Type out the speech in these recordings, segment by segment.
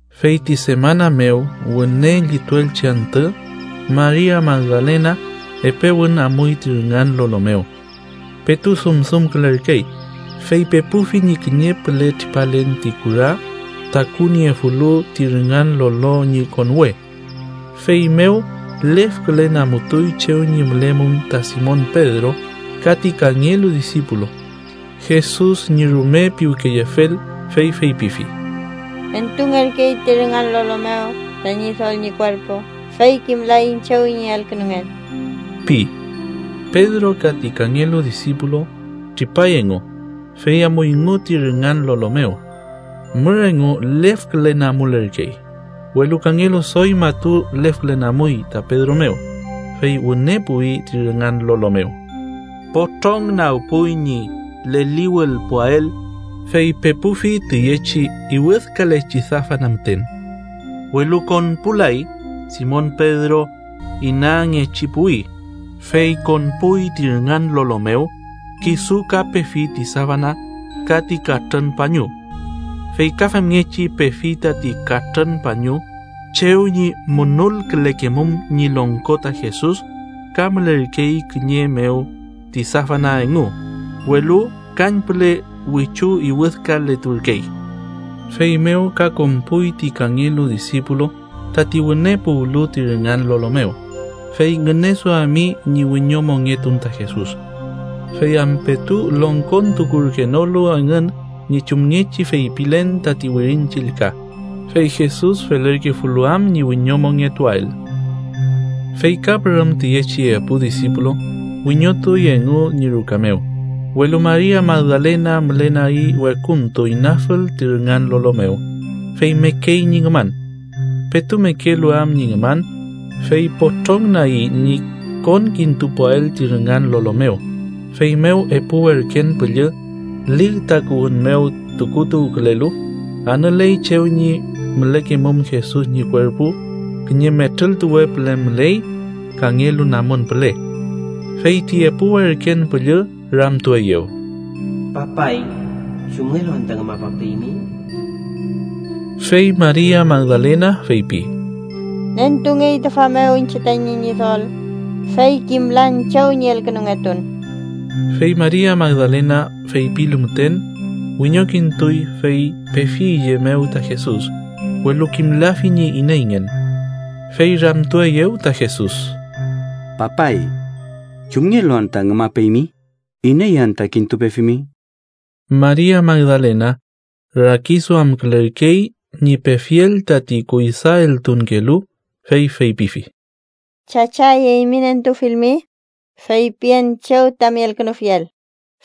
Fey ti semana mew wüne llituelchi antü, Maria Magdalena epe wün amuy ti rüngan lolo mew. Petu dumdumkülerkey, fey pepufi ñi kiñe püle tripalen ti kura takuniefulu ti rüngan lolo ñi konwe. Feymew lefkülen amutuy chew ñi mülemum ta Simon Pedro ka ti kangelu disipulu Jesus ñi rume piwkeyefel, fey feypifi: —¡Nentungerkey ti rüngan lolo mew ta Ñidol ñi kuerpu, fey kimlaiñ chew ñi elkünungen! ―pi. Pedro ka ti kangelu disipulu tripay engu, fey amuyngu ti rüngan lolo mew. Mür engu lefkülen amulerkey, welu kangelu doy matu lefkülen amuy ta Pedro mew, fey wüne puwi ti rüngan lolo mew. Potrong nagpuy ñi leliwülpuael, fey pepufi tüyechi iwüdkalechi safana müten, welu konpulay. Simon Pedro inangechi puwi, fey konpuy ti rüngan lolo mew, kisu ka pefi ti safana ka ti katrün pañu. Fey ka femngechi pefi tati katrün pañu chew ñi munulkülekemum ñi longko ta Jesus ka mülerkey kiñe mew ti safana engu, welu kañpüle wichu iwüdkaleturkey. Feymew ka konpuy ti kangelu disipulu tati wüne puwlu ti rüngan lolo mew, fey ngüneduami ñi wiñomongetun ta Jesus. Fey am petu longkontukurkenolu engün ñi chumngechi feypilen tati Wirin Chillka, fey Jesus felerkefulu am ñi wiñomongetuael. Fey ka pürüm tüyechi epu disipulu wiñotuy engu ñi ruka mew, welu Maria Magdalena mülenagi wekuntu, inafül ti rüngan lolo mew, fey mekey ñi ngüman. Petu mekelu am ñi ngüman, fey potrong nagi ñi konkintupuael ti rüngan lolo mew, feymew epu werken püllü lig takuwün mew tukutuwkülelu, anüley chew ñi mülekemum Jesus ñi kuerpu; kiñe metrültuwe püle müley, kangelu namun püle. Fey ti epu werken püllü ramtueyew: —Papay, ¿chumngelu anta ngümapapeymi? Fey Maria Magdalena feypi: —Nentungey tüfa mew iñche tañi Ñidol, fey kimlan chew ñi elkünungetun. Fey Maria Magdalena feypilu müten, wiñokintuy, fey pefi üye mew ta Jesus, welu kimlafi ñi ineyngen. Fey ramtueyew ta Jesus: —Papay, ¿chumngelu anta ngümapeymi? ¿Iney anta kintupefimi? Maria Magdalena rakiduamkülerkey ñi pefiel tati kuydaeltunkelu, fey feypifi: —Chachay, eymi nentufilmi, feypien chew tami elkünufiel,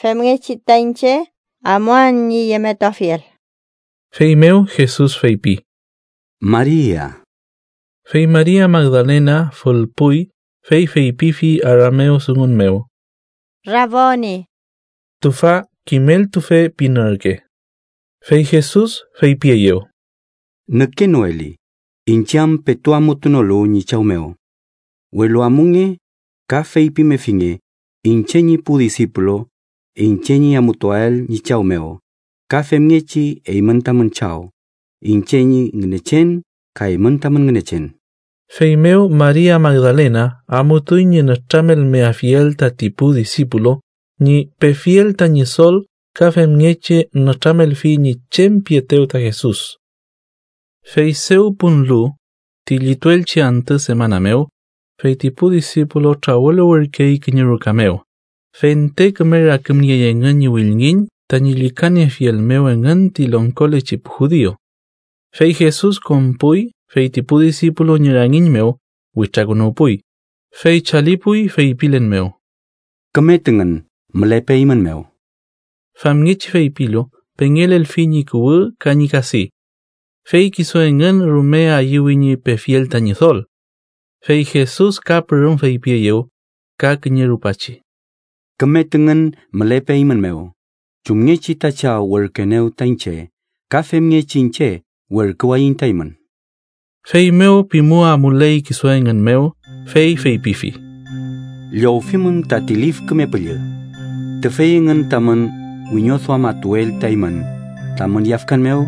femngechi ta iñche amuan ñi yemetuafiel. Feymew Jesus feypi: ¡Maria! Fey Maria Magdalena fülpuy, fey feypifi aramewdungun mew: —¡Raboni! (tüfa “kimeltufe” pin ürke.) Fey Jesus feypieyew: —Nükenoeli, iñche am petu amutunolu ñi Chaw mew. Welu amunge ka feypimefinge iñche ñi pu disipulu iñche ñi amutuael ñi Chaw mew, ka femngechi eymün tamün Chaw, iñche ñi Ngünechen ka eymün tamün Ngünechen. Feymew Maria Magdalena amutuy ñi nütramelmeafiel tati pu disipulu ñi pefiel ta Ñidol ka femngechi nütramelfi ñi chem pietew ta Jesus. Fey dew punlu, ti llituelchi antü semana mew, fey ti pu disipulu trawüluwürkey kiñe ruka mew, fente küme rakümniey engün ñi wülngiñ tañi llükaniefiel mew engün ti longkolechi pu judiu. Fey Jesus konpuy, fey ti pu disipulu ñi rangiñ mew witrakünuwpuy, fey chalipuy feypilen mew: —¡Küme tüngün mülepe eymün mew! Famngechi feypilu, pengelelfi ñi kuwü ka ñi kadi. Fey kisu engün rume ayüwi ñi pefiel ta Ñidol. Fey Jesus ka pürüm feypieyew ka kiñe rupachi: —¡Küme tüngün mülepe eymün mew! Chumngechi ta Chaw werküenew ta iñche ka femngechi iñche werküwayiñ ta eymün. Feymew pimu amuley kisu engün mew, fey feypifi: —Llowfimün tati Lif Küme Püllü. Tüfey engün tamün wiñoduamatuel ta eymün tamün yafkan mew,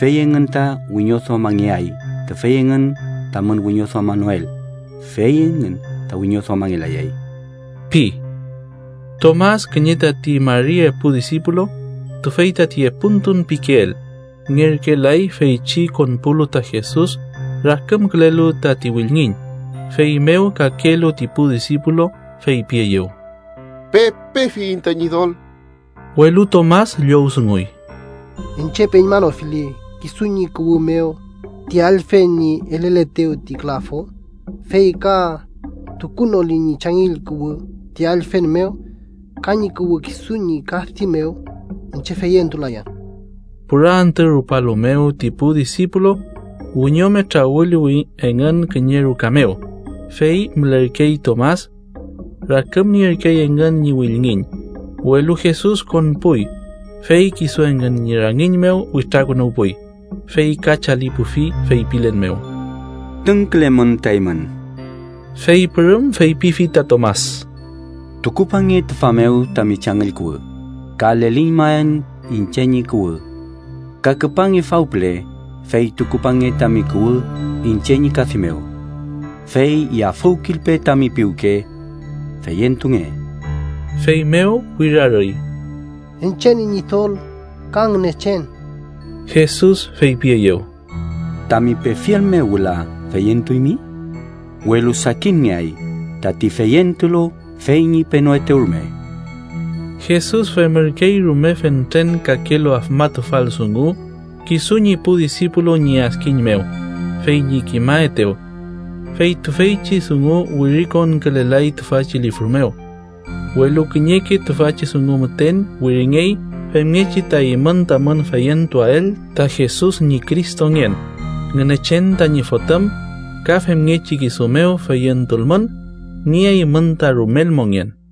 fey engün ta wiñoduamangeay, tüfey engün tamün wiñoduamanoel, fey engün ta wiñoduamangelayay ―pi. Tomas kiñe tati mari epu disipulu, tüfey tati Epuntun pikeel, ngerkelay feychi konpulu ta Jesus rakümkülelu tati wülngiñ. Feymew kakelu ti pu disipulu feypieyew: —Pepefiyiñ ta Ñidol. Welu Tomas llowdunguy: —Iñche peñmanofili kisu ñi kuwü mew ti allfen ñi eleletew ti külafu, fey ka tukunoli ñi changüll kuwü ti allfen mew ka ñi kuwü kisu ñi kadi mew, iñche feyentulayan. Pura antü rupalu mew ti pu disipulu wiñome trawüluwi engün kiñe ruka mew, fey mülerkey Tomas. Rakümnierkey engün ñi wülngiñ, welu Jesus konpuy, fey kisu engün ñi rangiñ mew witrakünuwpuy, fey ka chalipufi feypilen mew: —¡Tüngkülemün ta eymün! Fey pürüm feypifi ta Tomas: —Tukupange tüfa mew tami changüll kuwü, ka leliñmaen iñche ñi kuwü. Ka küpange faw püle fey tukupange tami kuwü iñche ñi kadi mew. Fey yafüwkilpe tami piwke. ¡Feyentunge! Feymew wirarüy: —¡Iñche ñi Ñidol ka Ngünechen! Jesus feypieyew: —¿Tami pefiel mew wüla feyentuymi? ¡Welu sakinngeay tati feyentulu fey ñi penoetew rume! Jesus femürkey rume fentren kakelu afmatufal dungu kisu ñi pu disipulu ñi adkiñ mew fey ñi kimaetew. Fey tüfeychi dungu wirikonkülelay tüfachi lifru mew. Welu kiñeke tüfachi dungu müten wiringey femngechi ta eymün tamün feyentuael ta Jesus ñi Cristongen, Ngünechen tañi Fotüm, ka femngechi kisu mew feyentulmün, nieaymün ta rumel mongen.